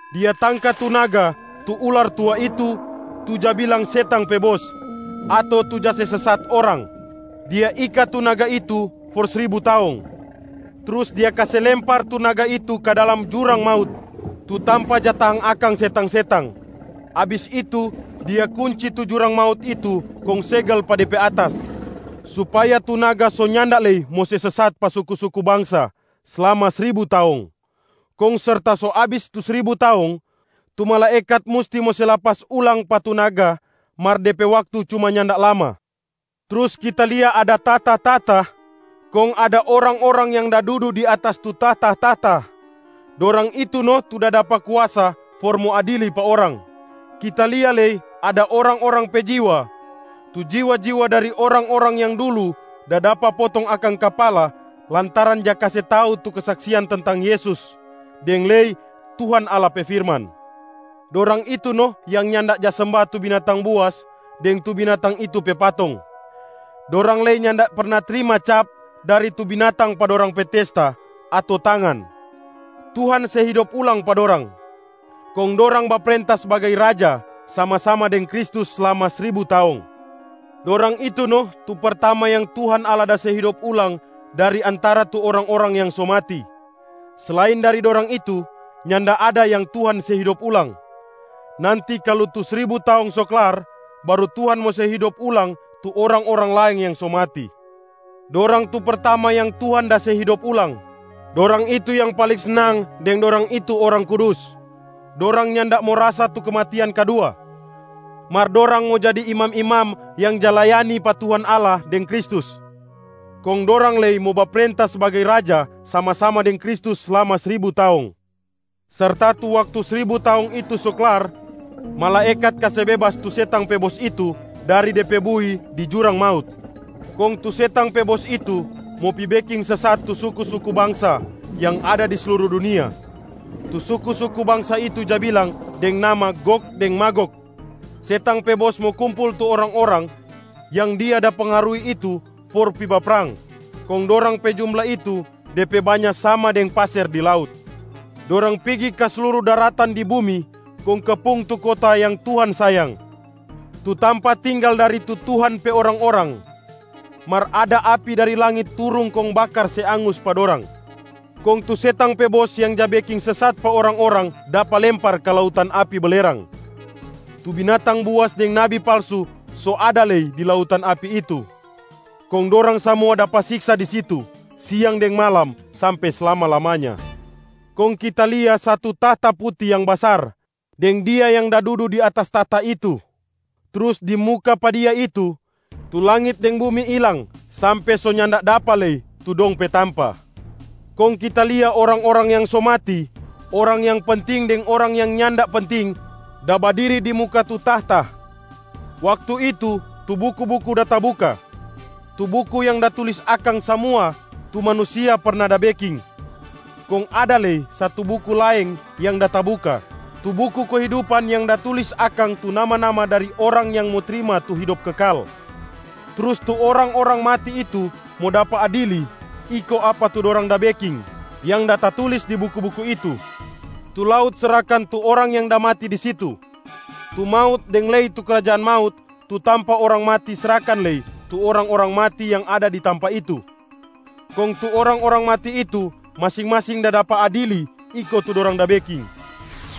Dia tangka tu naga, tu ular tua itu, tu ja bilang setang pe bos ato tu ja se sesat orang. Dia ika tu naga itu for sribu taong, trus dia kase lempar tu naga itu ka dalam jurang maut tu tampa ja tahang akang setang-setang. Abis itu dia kunci tu jurang maut itu kong segel pa de pe atas, supaya tu naga so nyanda lei mo se sesat pa suku-suku bangsa slama sribu taong. Kong serta so abis tu sribu taong, tu malaekat musti mo se lapas ulang pa tu naga mar de pe waktu cuma nyanda lama. Trus kita lia ada tahta-tahta. Kong ada orang-orang yang da dudu di atas tu tahta-tahta, dorang itu no tu da dapa kuasa for mo adili pa orang. Kita lia lei ada orang-orang pe jiwa, tu jiwa-jiwa dari orang-orang yang dulu da dapa potong akang kapala lantaran ja kase tau tu kesaksian tentang Yesus deng lei Tuhan Allah pe firman. Dorang itu no yang nyanda ja semba tu binatang buas deng tu binatang itu pe patong, dorang lei nyanda perna trima cap dari tu binatang pa dorang pe testa ato tangan. Tuhan se hidop ulang pa dorang, kong dorang baprenta sbagai raja sama-sama deng Kristus slama sribu taong. Dorang itu no tu pertama yang Tuhan Allah da se hidop ulang dari antara tu orang-orang yang so mati. Selain dari dorang itu, nyanda ada yang Tuhan se hidop ulang. Nanti kalu tu sribu taong so klar, baru Tuhan mo se hidop ulang tu orang-orang laeng yang so mati. Dorang tu pertama yang Tuhan da se hidop ulang, dorang itu yang paling snang deng dorang itu orang kudus. Dorang nyanda mo rasa tu kematian kadua. Mar dorang mo jadi imam-imam yang ja layani pa Tuhan Allah deng Kristus, kong dorang lei mo baprenta sbagai raja sama-sama deng Kristus slama sribu taong. Serta tu waktu sribu taong itu so klar, malaekat kase bebas tu setang pe bos itu dari de pe bui di jurang maut. Kong tu setang pe bos itu mo pi beking sesat tu suku-suku bangsa yang ada di sluru dunia, tu suku-suku bangsa itu ja bilang deng nama Gog deng Magog. Setang pe bos mo kumpul tu orang-orang yang dia da pengaruhi itu for pi baprang. Kong dorang pe jumla itu, de pe banya sama deng paser di laut. Dorang pigi ka sluru daratan di bumi kong kepung tu kota yang Tuhan sayang, tu tampa tinggal dari tu Tuhan pe orang-orang. Mar ada api dari langit turung kong bakar se angus pa dorang. Kong tu setang pe bos yang ja beking sesat pa orang-orang dapa lempar ka lautan api belerang. Tu binatang buas deng nabi palsu so ada lei di lautan api itu, kong dorang samua dapa siksa di situ siang deng malam sampe slama-lamanya. Kong kita lia satu tahta puti yang basar deng Dia yang da dudu di atas tahta itu. Trus di muka pa Dia itu, tu langit deng bumi ilang sampe so nyanda dapa lei tu dong pe tampa. Kong kita lia orang-orang yang so mati, orang yang penting deng orang yang nyanda penting da badiri di muka tu tahta. Waktu itu tu buku-buku da tabuka, tu buku yang da tulis akang samua tu manusia perna da beking. Kong ada lei satu buku laeng yang da tabuka, tu buku kehidupan yang da tulis akang tu nama-nama dari orang yang mo trima tu hidop kekal. Trus tu orang-orang mati itu mo dapa adili iko apa tu dorang da beking yang da tatulis di buku-buku itu. Tu laut srahkan tu orang yang da mati di situ. Tu maut deng lei tu krajaan maut tu tampa orang mati srahkan lei tu orang-orang mati yang ada di tampa itu. Kong tu orang-orang mati itu masing-masing da dapa adili iko tu dorang da beking.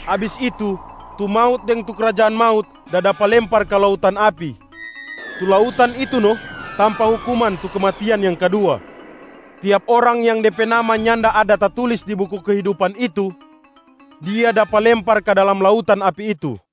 Abis itu, tu maut deng tu krajaan maut da dapa lempar ka lautan api. Tu lautan itu no tampa hukuman tu kematian yang kadua. Tiap orang yang de pe nama nyanda ada tatulis di buku kehidupan itu, dia dapa lempar ka dalam lautan api itu.